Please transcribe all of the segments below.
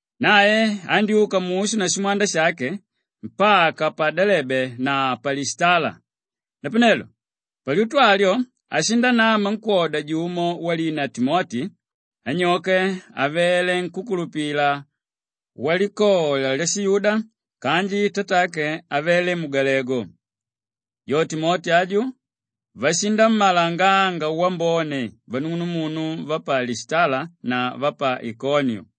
Nae andyúka mushu na shimwanda shake mpaka pa Delebe na pa Lishitala; napanelo palyutu alyo ashindanama nkwóda jumo walina Timoti; anyoke avele nkúkulupila walikola lyashiyuda kanji tatake avele mugalegu. Jo Timoti aju, vashinammalanganga wambone vanung'unumunu va pa Lishitala na va pa Ikoniu.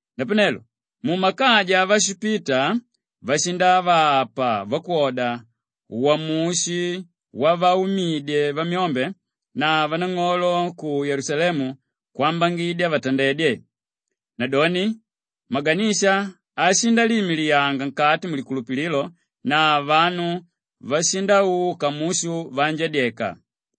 Napanelo mumakaja avashipita, vashindavapa vakwoda uwamushi wavaumidye vamyombe na vanang'olo ku Yelusalemu kwambangidya vatandedye. Nadoni maganisha ashindaliimiliyanga nkati mulikulupililo na vanu vashindauka mushu vaanjadyeka.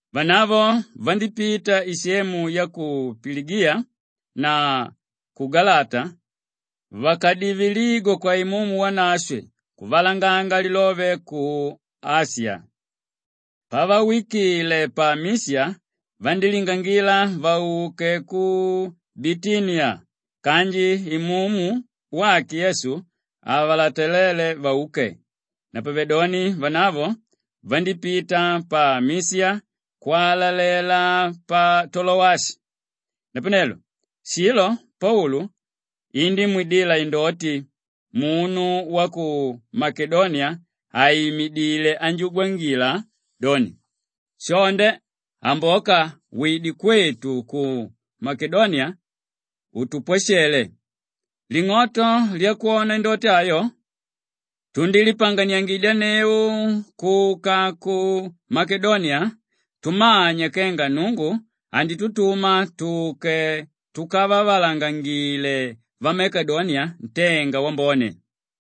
Vanavo vandípita isemu ya ku Piligiya na ku Galata vakadivililigwa kwa Imumu Wanashwe kuvalanganga lilove ku Ashiya. Pavawikile pa Mishiya, vandílingangila vauke ku Bitiniya kanji Imumu wake Yesu havalataléle vauke. Napavedoni vanavo vandípita pa Mishiya kwalalela pa Tolowashi. Napanelo shilo Paulu indímwidila indoti: munu wa ku Makedoniya àimidile anjugwangila doni, “Shonde, amboka wide kwetu ku Makedoniya utupwashele.” Ling'oto lyakwona indoti ayo, tundílipanganiyangidyanneu kuka ku Makedoniya tumanya kenga Nnungu anditutuma tuke tukavavalangangile vamakedoniya ntenga wambone.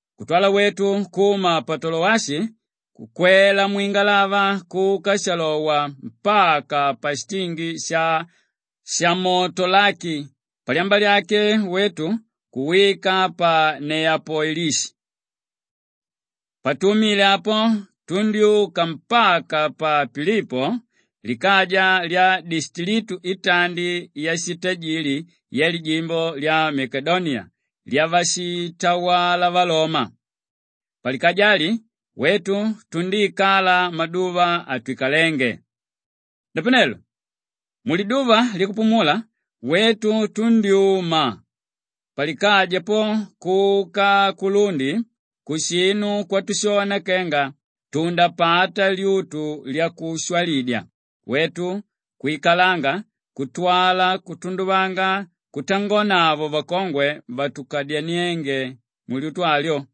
Kutwala wetu kuma pa Tolowashi kukwela mwingalava kuka shalowa mpaka pashitingi sha Shamotolaki; palyamba lyake wetu kuwika pa Neyapolishi. Patumile apo tundyúka mpaka pa Pilipo likaja lya dishiklitu itandi yashitajili yalijimbo lya Makedoniya lyavashitawala valoma. Palikaja ali, wetu tundíikala maduva atwikalénge. Napanelo muliduva lyakupumula, wetu tundyúma palikaja po kuka kulundi kushinu kwatushona kenga tundapata lyutu lyakushwalidya; wetu kwikalanga kutwala kutunduvanga kutangonavo vakongwe vakadyaniénge mulyutu alyo.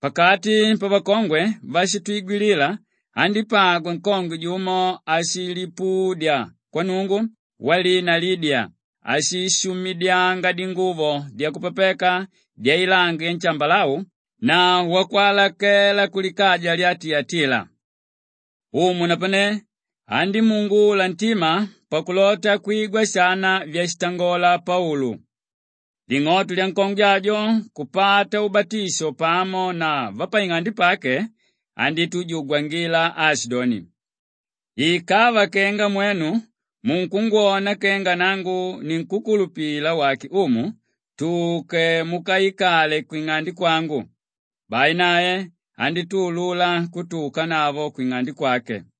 Pakati pavakongwe váshitwigwilila andípagwa nkongwe jumo áshilipudya kwa Nnungu walina Lidiya áshishumidyanga dinguvo dyakupapeka dyailangi yanshambalau na wakwalakela kulikaja lya Tiyatila. Umu napane andímuungula ntima pakulota kwigwa shana vyashitangola Paulu. Ling'oto lyankongwe ajo kupata ubatisho pamo na vapaing'ande pake, andítujugwangila aashidoni, “Ikava kenga mwenu munkungwona kenga nangu ninkúkulupila wake Umu, tuke mukaikale kwing'ande kwangu.” Bai nae andítuulula kutuukanavo kwing'ande kwake.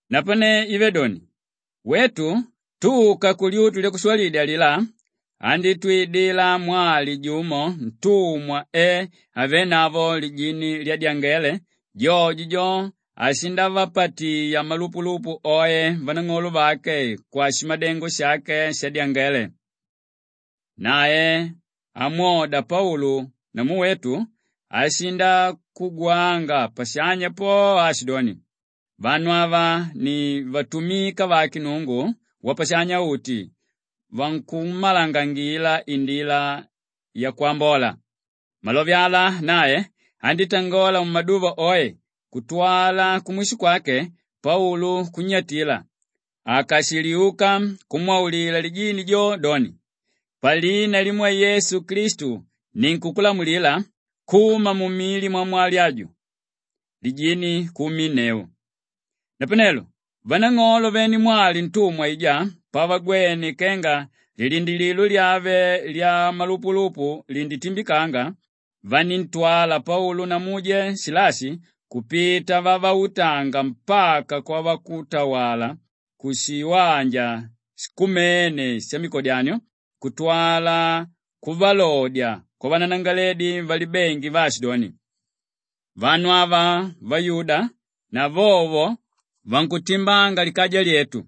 Napane ive doni, wetu tuka kulyutu lyakushwalidya alilá, andítwidila mwali jumo ntumwa e avénavo lijini lyadyangele; jojo jo, ashindavapatiya malupulupu oe vanang'olo vake kwashimadengo shake shadyangele. Nae amwoda Paulu namu wetu ashindakugwanga pashanya po aashidoni, “Vanu ava ni vatumika vake Nnungu Wapashanya-uti; vankummalangangila indila yakwambola.” Malove ala nae andítangola mumaduva oe kutwala kumwisho kwake Paulu kunnyatila; akashiliuka kumwaulila lijini jo doni, “Palina limwe Yesu Klistu ninkukulamulila, kuma mumili mwamwali aju!” Lijini kuuminneu. Napanelo vanang'olo vene mwali ntumwa aijá pavagwene kenga lilindilililo lyave lyamalupulupu linditimbikanga, vaníntwala Paulu na muje Shilashi kupita vavautanga mpaka kwavakutawala kushiwanja shikumene shamikodyanio kutwala kuvalodya kwavananangalaledi valibengi vaashidoni, “Vanu ava vayuda na vovo vankutimbanga likaja lyetu.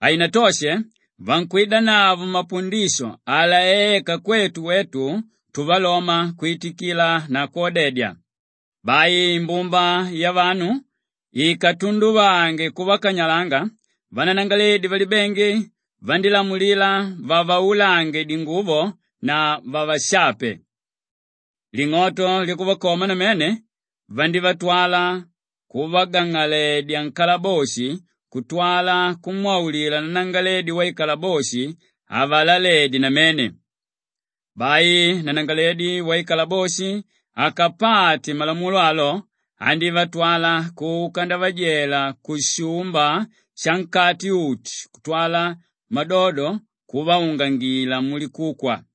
Hainatoshe vankwidanavo mapundisho alaéka kwetu wetu tuvaloma kwitikila na kwodedya.” Bai imbumba yavanu ikatunduvange kuvakanyalanga, vananangalaledi valibengi vandílamulila vavaulange dinguvo na vavashape. Ling'oto lyakuvakoma namene, vandívatwala kuvagang'aledya nkalaboshi kutwala kumwaulila nanangalaledi waikalaboshi avalaledye namene. Bai nanangalaledi waikalaboshi akapate malamulo alo, andívatwala kuka ndavajela kushumba shankati uti kutwala madodo kuvaungangila mulikukwa.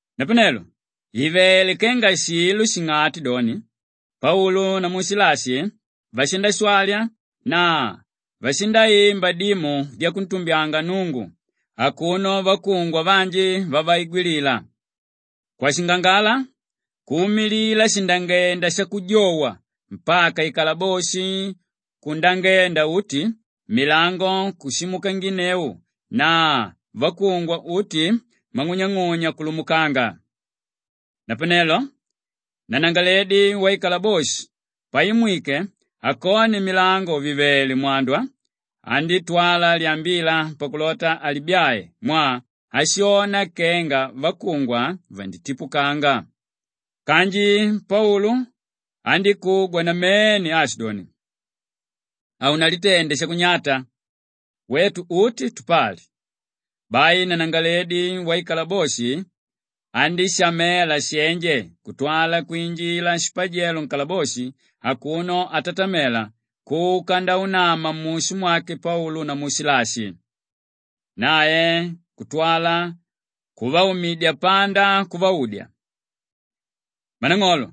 Napanelo ìvele kenga shilo shing'ati doni, Paulu namu Shilashi vashindashwali na vashindaimba dimu dyakuntumbyanga Nnungu akuno vakungwa vanji vavaigwilila. Kwashingangala kuumilila shindangenda shakujowa mpaka ikalaboshi kundangenda uti, milango kushimukanginneu na vakungwa uti mang'unyang'unya kuungukanga. Napanelo nanangalaledi waikalaboshi paimwike, akone milango vìvele mwandwa, andítwala lyambila pakulota alibyae mwaa ashona kenga vakungwa vanditipukanga. Kanji Paulu andíkugwa namene aashidoni, “Haunalitende shakunyata! Wetu uti tupali.” Bai nanangalaledi waikalaboshi andíshamela shenje kutwala kwinjila shipajelo nkalaboshi akuno atatamela kuka ndaunama mushu mwake Paulu namu Shilashi. Nae kutwala kuvaumidya panda kuvaudya, “Mmanang'olo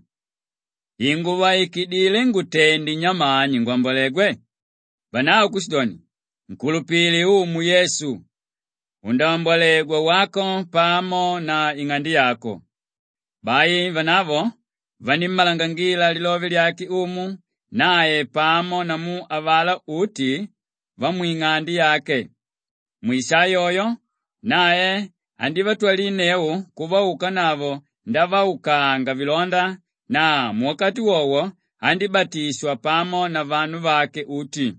inguvaikidile ngutende nyamani ngwambolegwe?” Vanavo kushidoni, “Nkulupile Umu Yesu, undaambwalegwa, wako pamo na ing'ande yako.” Bai vanavo vanímmalangangila lilove lyake Umu nae pamo namu avalá uti vamwing'ande yake. Mwisaa yoyo nae andívatwalinneu kuvaukanavo ndavaukanga vilonda na muwakati wowo andíbatishwa pamo na vanu vake uti.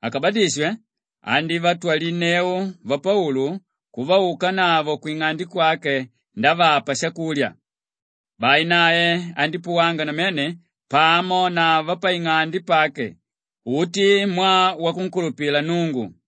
Akabatishwe, andívatwalinneu vapaulu kuvaukanavo kwing'ande kwake ndavapa shakulya. Bai nae andípuwanga namene pamo na vapaing'ande pake uti mwaa wakunkulupila Nnungu.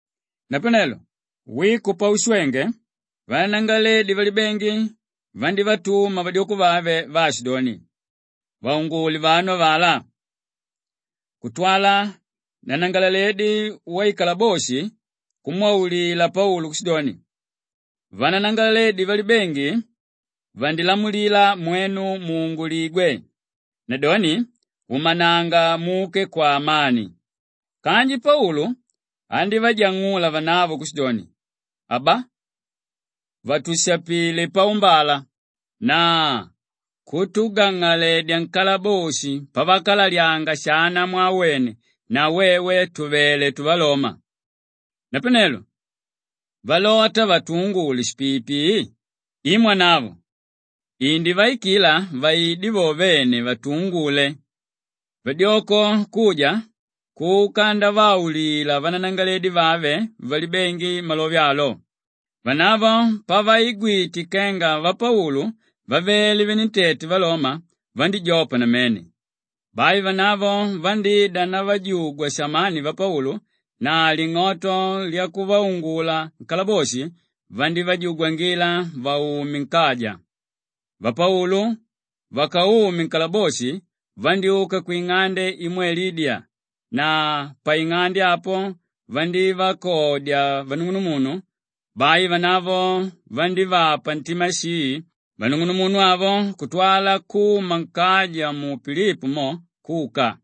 Napanelo wiko paushwenge, vananangalaledi valibengi vandívatuma vadyoko vave vaashidoni, “Vaungule vanu avalá.” Kutwala nanangalaledi waikalaboshi kumwaulila Paulu kushidoni, “Vananangalaledi valibengi vandilamulila mwenu muunguligwe. Nadoni umananga muke kwaamani!” Kanji Paulu andívajang'ula vanavo kushidoni, “Aba! Vatushapilé paumbala na kutugang'aledya nkalaboshi pavakalalyanga shana mwaa wene na wewe tùvele tuvaloma! Napanelo valota vatuungule shipiipii? I mwanavo! Indivaikila vaide vo vene, vatuungule.” Vadyoko kuja kuka ndavaulila vananangalaledi vave valibengi malove alo. Vanavo pavaigwite kenga vapaulu vavele venentete valoma, vandíjopa namene. Bai vanavo vandída ndavajugwa samaani vapaulu na ling'oto lyakuvaungula nkalaboshi, vandívajugwangila vaume nkaja. Vapaulu vakaume nkalaboshi vandyúka kwing'ande imwe Lidiya na paing'ande apo vandívakodya vanung'unumunu; bai vanavo vandívapa ntima shii vanung'unumunu avo kutwala kuma nkaja mu Pilipo mo kuka.